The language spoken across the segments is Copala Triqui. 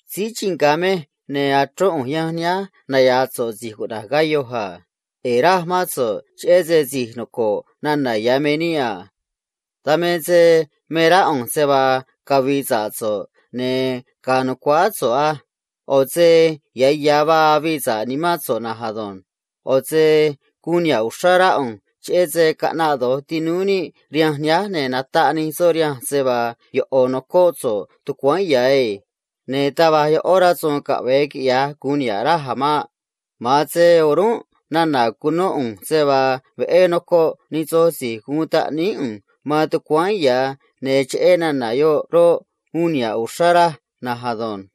Síí chii nga̱ mej, ne̱ achrón ꞌu̱nj yanj nihánj naya̱a̱ so̱ꞌ si̱j cuꞌna̱j Gayo a. ꞌE̱e̱ raj mán so̱ꞌ, cheꞌé se si̱j noco̱ꞌ nana̱ ya̱ me níꞌ a. Dan me se me rá ꞌu̱nj se vaa cavi̱i̱ sa̱ꞌ so̱ꞌ ne̱ ga̱a̱ nu̱cuáá so̱ꞌ á. ꞌO̱ se ya̱ ya̱ va̱j avii sa̱ꞌ nimán so̱ꞌ na̱nj ado̱nj. ꞌO̱ se guun niha̱ꞌ uxrá rá ꞌu̱nj, cheꞌé se caꞌnaꞌ do̱j tinúú níꞌ rihanj nihánj, ne̱ nataꞌ nij soꞌ rihanj se vaa yoꞌo̱ nocóꞌ so̱ꞌ tucuáán ya̱ ei. Ne̱ taj va̱j yoꞌó rasu̱u̱n caꞌve̱e quiꞌya̱j gu̱un niha̱ꞌ raj a̱ maꞌ. Ma̱a̱n se o̱rúnꞌ nana̱ cunó ꞌu̱nj se vaa veꞌé nocoꞌ nij soj si̱j guun taꞌníí ꞌu̱nj man tucuáán ya̱, ne̱ cheꞌé nana̱ yoꞌ roꞌ, uun niha̱ꞌ uxrá raj na̱nj ado̱nj.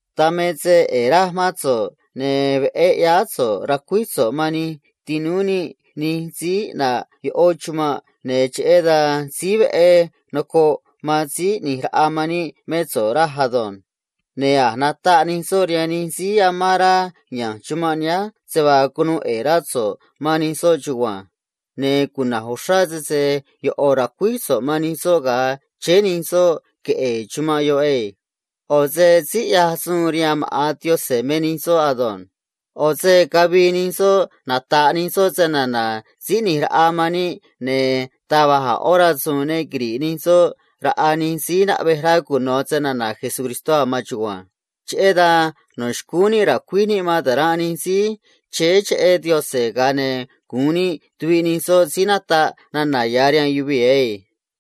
Dan me se ꞌe̱e̱ raj mán so̱ꞌ, ne̱ veꞌé ꞌyáá so̱ꞌ racuíj so̱ꞌ man nij tinúú níꞌ nij síí ꞌnaꞌ yoꞌó chumanꞌ, ne̱ cheꞌé dan síí veꞌé nocoꞌ man síí ꞌni̱j raꞌa man níꞌ mé so̱ꞌ, raj ado̱nj. Ne̱ a̱j nataꞌ nij soꞌ rihaan nij síí amán rá ya̱nj chumanꞌ nihánj se vaa cunuu ꞌe̱e̱ rá so̱ꞌ man nij soꞌ chugua̱nj. Ne̱ cuna̱j uxrá sese yoꞌo̱ ra̱cuíj so̱ꞌ man nij soꞌ ga̱a chéé nij soꞌ queꞌe̱e̱ chumanꞌ yoꞌ ei. ꞌO̱ se síí ꞌyaj suun rihaan maꞌa̱n Diose̱ me nij soꞌ ado̱nj. ꞌO̱ se cavii nij soꞌ nata̱ꞌ nij soꞌ se‑na̱na̱ síí ꞌni̱j raꞌa man níꞌ, ne̱ taj va̱j a̱ ꞌó rasu̱u̱n ne quiri̱ꞌ nij soꞌ raꞌa nij síí naꞌvej rá cuno̱ se‑na̱na̱ Jesucristó a̱ man chugua̱nj. Cheꞌé dan no̱ xcúún níꞌ ra̱cuíj níꞌ man taranꞌ nij síí chéé cheꞌé Diose̱, ga̱a ne̱ gu̱un níꞌ tuviꞌ nij soꞌ síí nataꞌ nana̱ ya̱ rihaan yuvii̱ ei.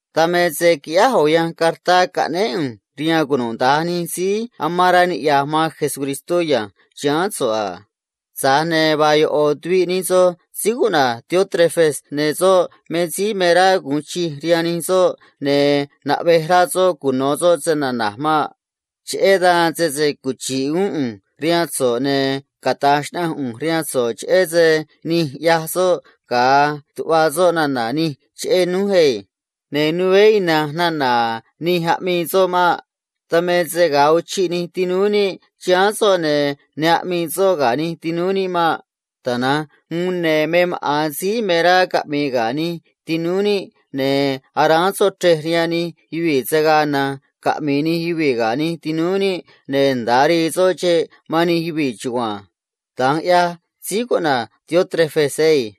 Dan me se quiꞌyáj ꞌo̱ yanj cartá caꞌnéé ꞌu̱nj rihaan cunuda̱nj nij síí amán rá niꞌya̱j man Jesucristó ya̱nj chiháán so̱ꞌ a. Tza̱j ne̱ vaa yoꞌo̱ tuviꞌ nij soꞌ síí cuꞌna̱j Diótrefes, ne̱ soꞌ me síí me rá gu̱un chij rihaan nij soꞌ, ne̱ naꞌvej rá soꞌ cuno̱ soꞌ se‑na̱na̱j maꞌ. Cheꞌé dan, sese cuchi̱ꞌ uún ꞌu̱nj rihaan so̱ꞌ, ne̱ cata̱j xnaꞌanj ꞌu̱nj rihaan so̱ꞌ cheꞌé se nij ꞌyaj soꞌ ga̱a tuꞌva soꞌ nana̱ nij cheꞌé núj ei. Ne̱ nuveé ina̱nj nana̱ nij aꞌmii soꞌ maꞌ. Dan me se ga̱a uchiꞌ nij tinúú níꞌ chiháán so̱ꞌ, ne̱ ne aꞌmii soꞌ ga̱ nij tinúú níꞌ maꞌ. Tana̱nj uún, ne̱ me maꞌa̱n síí me rá caꞌmi̱i̱ ga̱ nij tinúú níꞌ, ne̱ aráán soꞌ chrej rihaan nij yuvii̱ se̱ gaa na̱nj caꞌmi̱i̱ nij yuvii̱ ga̱ nij tinúú níꞌ, ne̱ nda̱a rii soꞌ xeꞌ man nij yuvii̱ chugua̱nj. Da̱nj ꞌyaj síí cuꞌna̱j Diótrefes ei.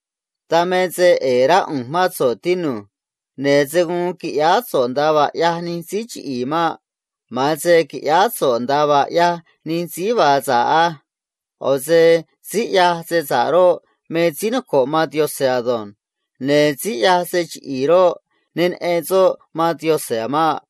Dan me se ꞌe̱e̱ rá ꞌu̱nj mán so̱ꞌ, tinu̱j. Ne̱ se̱ guun qui̱ꞌyáá so̱ꞌ nda̱a vaa ꞌyaj nij síí chiꞌi̱i̱ maꞌ. Ma̱a̱n se qui̱ꞌyáá so̱ꞌ nda̱a vaa ꞌyaj nij síí vaa sa̱ꞌ á. ꞌO̱ se síí ꞌyaj se sa̱ꞌ roꞌ, me síí noco̱ꞌ man Diose̱ ado̱nj. Ne̱ síí ꞌyaj se chiꞌi̱i̱ roꞌ, ne neꞌen soꞌ man Diose̱ a̱ maꞌ.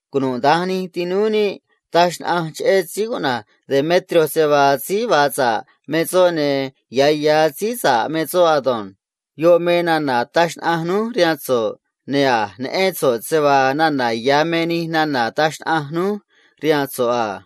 Cunuda̱nj nij tinúú níꞌ taj xnaꞌanj cheꞌé síí cuꞌna̱j Demetrio se vaa síí vaa sa̱ꞌ me soꞌ, ne̱ ya̱ ya̱ síí sa̱ꞌ me soꞌ ado̱nj. Yoꞌ me nana̱ taj xnaꞌanj núj rihaan so̱ꞌ, ne̱ a̱j neꞌén so̱ꞌ se vaa nana̱ ya̱ me nij nana̱ ataj xnaꞌanj núj rihaan so̱ꞌ a.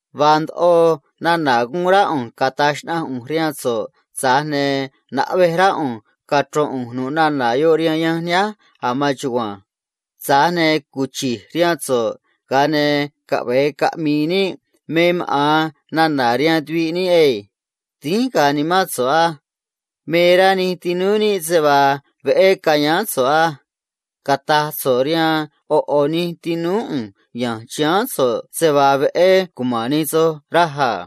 Vaa ndoꞌo nana̱ guun rá ꞌu̱nj cata̱j xnaꞌanj ꞌu̱nj rihaan so̱ꞌ, tza̱j ne̱ naꞌvej rá ꞌu̱nj cachro̱n ꞌu̱nj nu̱ꞌ nana̱ yoꞌ rihaan yanj nihánj a̱ man chugua̱nj. Tza̱j ne̱ cuchi̱j rihaan so̱ꞌ, ga̱a ne̱ caꞌve̱e caꞌmi̱i̱ níꞌ me maꞌa̱n nana̱ rihaan tuviꞌ níꞌ ei. Dínj ga̱a̱ nimán so̱ꞌ á. Me rá nij tinúú níꞌ se vaa veꞌé ca̱yáán so̱ꞌ á. Cata̱j so̱ꞌ rihaan ꞌo̱ ꞌo̱ nij tinúú ꞌu̱nj ya̱nj chiháán so̱ꞌ se vaa veꞌé cuma̱n nij soꞌ raj a.